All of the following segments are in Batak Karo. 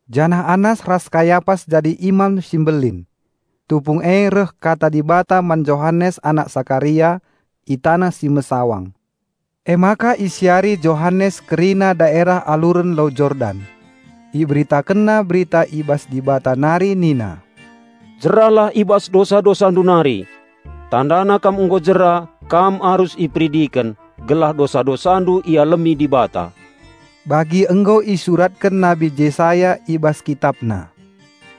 janah Annas ras Kayapas jadi Imam si Mbelin. Tupung e reh Kata Dibata man Johanes anak Sakaria, i taneh si mesawang. Emaka isiari Johanes kerina daerah aluren Lau Jordan. Iberitakenna Berita i bas Dibata nari nina, "Jeralah i bas dosa-dosandu nari! Tandana kam nggo jera, kam arus iperidiken, gelah dosa-dosandu ialemi Dibata." Bagi nggo isuratken Nabi Jesaya i bas kitapna,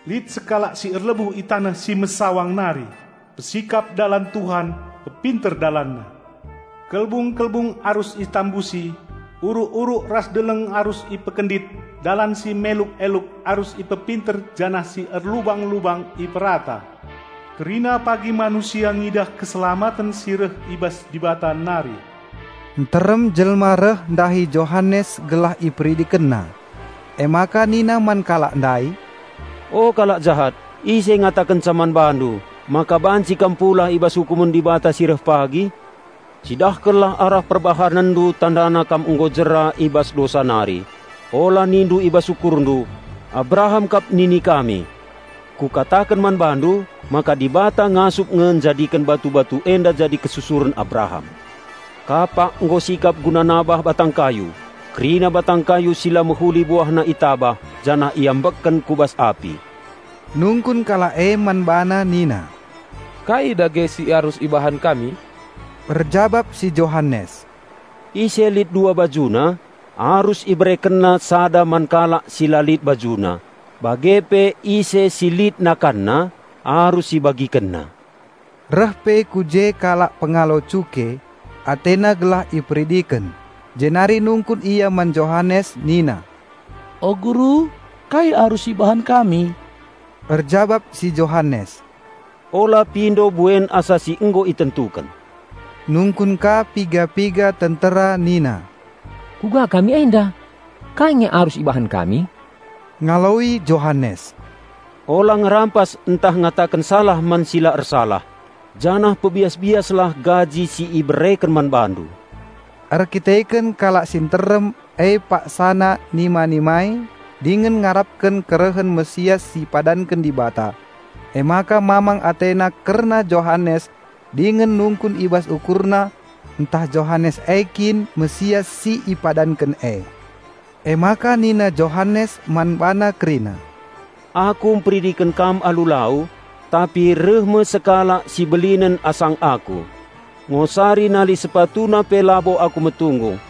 "Lit sekalak si erlebuh i taneh si mesawang nari, 'Pesikap dalan Tuhan -- Pepinter DalanNa! Kelbung-kelbung arus itambusi, uruk-uruk ras deleng arus ipekendit dalan si meluk-eluk arus ipepinter janah si erlubang-lubang iperata. Kerina pagi manusia ngidah keselamaten si reh i bas Dibata nari!'" Nterem jelma reh ndahi Johanes gelah iperidikenna. Emaka nina man kalak ndai, "O, kalak jahat, ise ngatakenca man bandu, maka banci kam pulah i bas ukumen Dibata si reh pagi? Cidahkenlah arah perbahanenndu tandana kam nggo jera i bas dosa nari. Ola nindu i bas ukurndu, 'Abraham kap nini kami.' Kukataken man bandu maka Dibata ngasup nge njadiken batu-batu enda jadi kesusuren Abraham. Kapak nggo sikap guna nabah batang kayu; kerina batang kayu si la mehuli buahna itabah janah iambekken ku bas api." Nungkun kalak e man bana nina, "Kai dage si arus ibahan kami?" Erjabap si Johanes, "Ise lit dua bajuna, arus iberekenna sada man kalak si la lit bajuna, bage pe ise si lit nakanna, arus ibagikenna." Reh pe ku je kalak pengalo cuke, atena gelah iperidiken, jenari nungkun ia man Johanes nina, "O guru, kai arus ibahan kami?" Erjabap si Johanes, "Ola pindo buen asa si nggo itentuken." Nungkun ka piga-piga tentera nina, "Kuga kami enda? Kai nge arus ibahan kami?" Ngaloi Johanes, "Ola ngerampas ntah ngataken salah man si la ersalah. Janah pebias-biaslah gaji si ibereken man bandu." Erkiteken kalak si nterem e paksana nima-nimai dingen ngarapken kerehen Raja Penampat si ipadanken Dibata, emaka mamang atena kerna Johanes dingen nungkun i bas ukurna ntah Johanes e kin Raja Penampat si ipadanken e. Emaka nina Johanes man bana kerina, "Aku mperidiken kam alu lau, tapi reh me sekalak si belinen asang aku. Ngosari nali SepatuNa pe labo aku metunggung.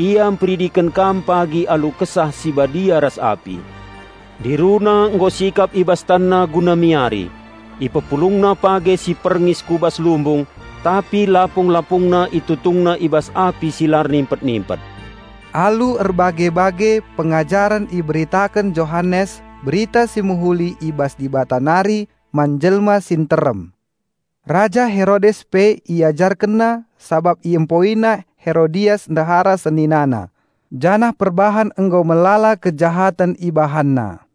Ia mperidiken kam pagi alu Kesah Si Badia ras api. Ndiruna nggo sikap i bas TanNa guna miari. Ipepulungna page si perngis ku bas lumbung, tapi lapung-lapungna ItutungNa i bas api si la ernimpet-nimpet." Alu erbage-bage pengajaren iberitaken Johanes Berita Si Mehuli i bas Dibata nari man jelma si nterem. Raja Herodes pe iajarkenna sabap iempoina Herodias ndehara seninana janah perbahan nggo melala kejahaten ibahanna.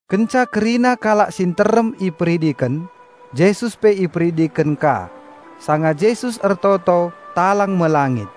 Kenca kerina kalak si nterem iperidiken, Jesus pe iperidiken ka. Sanga Jesus ertoto talang me langit,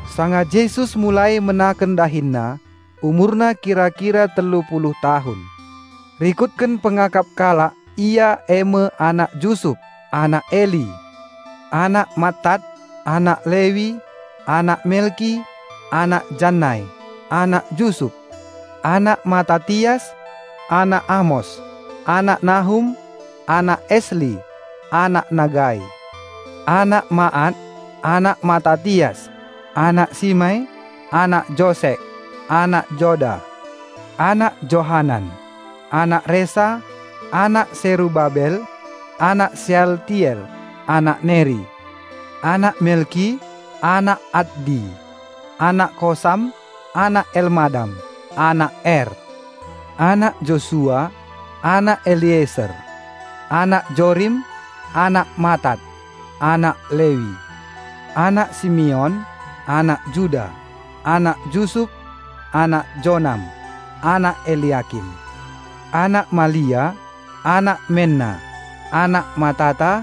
Sanga Jesus mulai menaken DahinNa, umurna kira-kira telu puluh tahun. Rikutken pengakap kalak Ia e me anak Jusup, anak Eli, anak Mattat, anak Lewi, anak Melki, anak Jannai, anak Jusup, anak Matatias, anak Amos, anak Nahum, anak Esli, anak Nagai, anak Maat, anak Matatias, anak Simei, anak Josek, anak Joda, anak Johanan, anak Resa, anak Serubabel, anak Sealtiel, anak Neri, anak Melki, anak Addi, anak Kosam, anak Elmadam, anak Er, anak Josua, anak Elieser, anak Jorim, anak Matat, anak Lewi, anak Simeon, anak Juda, anak Jusup, anak Jonam, anak Eliakim, anak Malia, anak Menna, anak Matata,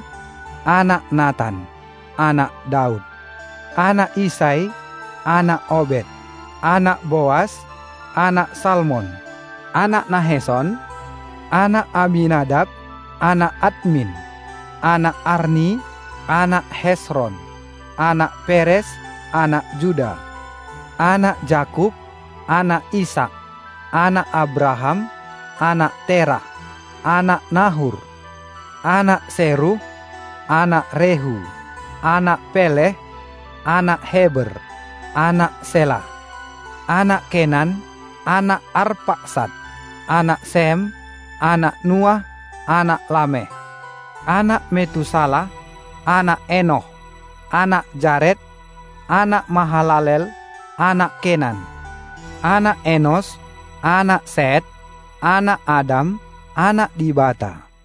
anak Natan, anak Daud, anak Isai, anak Obed, anak Boas, anak Salmon, anak Nahesson, anak Aminadap, anak Admin, anak Arni, anak Hesron, anak Peres, anak Juda, anak Jakup, anak Isak, anak Abraham, anak Terah, anak Nahur, anak Seruh, anak Rehu, anak Peleh, anak Heber, anak Selah, anak Kenan, anak Arpaksat, anak Sem, anak Nuah, anak Lameh, anak Metusalah, anak Enoh, anak Jaret, anak Mahalalel, anak Kenan, anak Enos, anak Set, anak Adam, anak Dibata.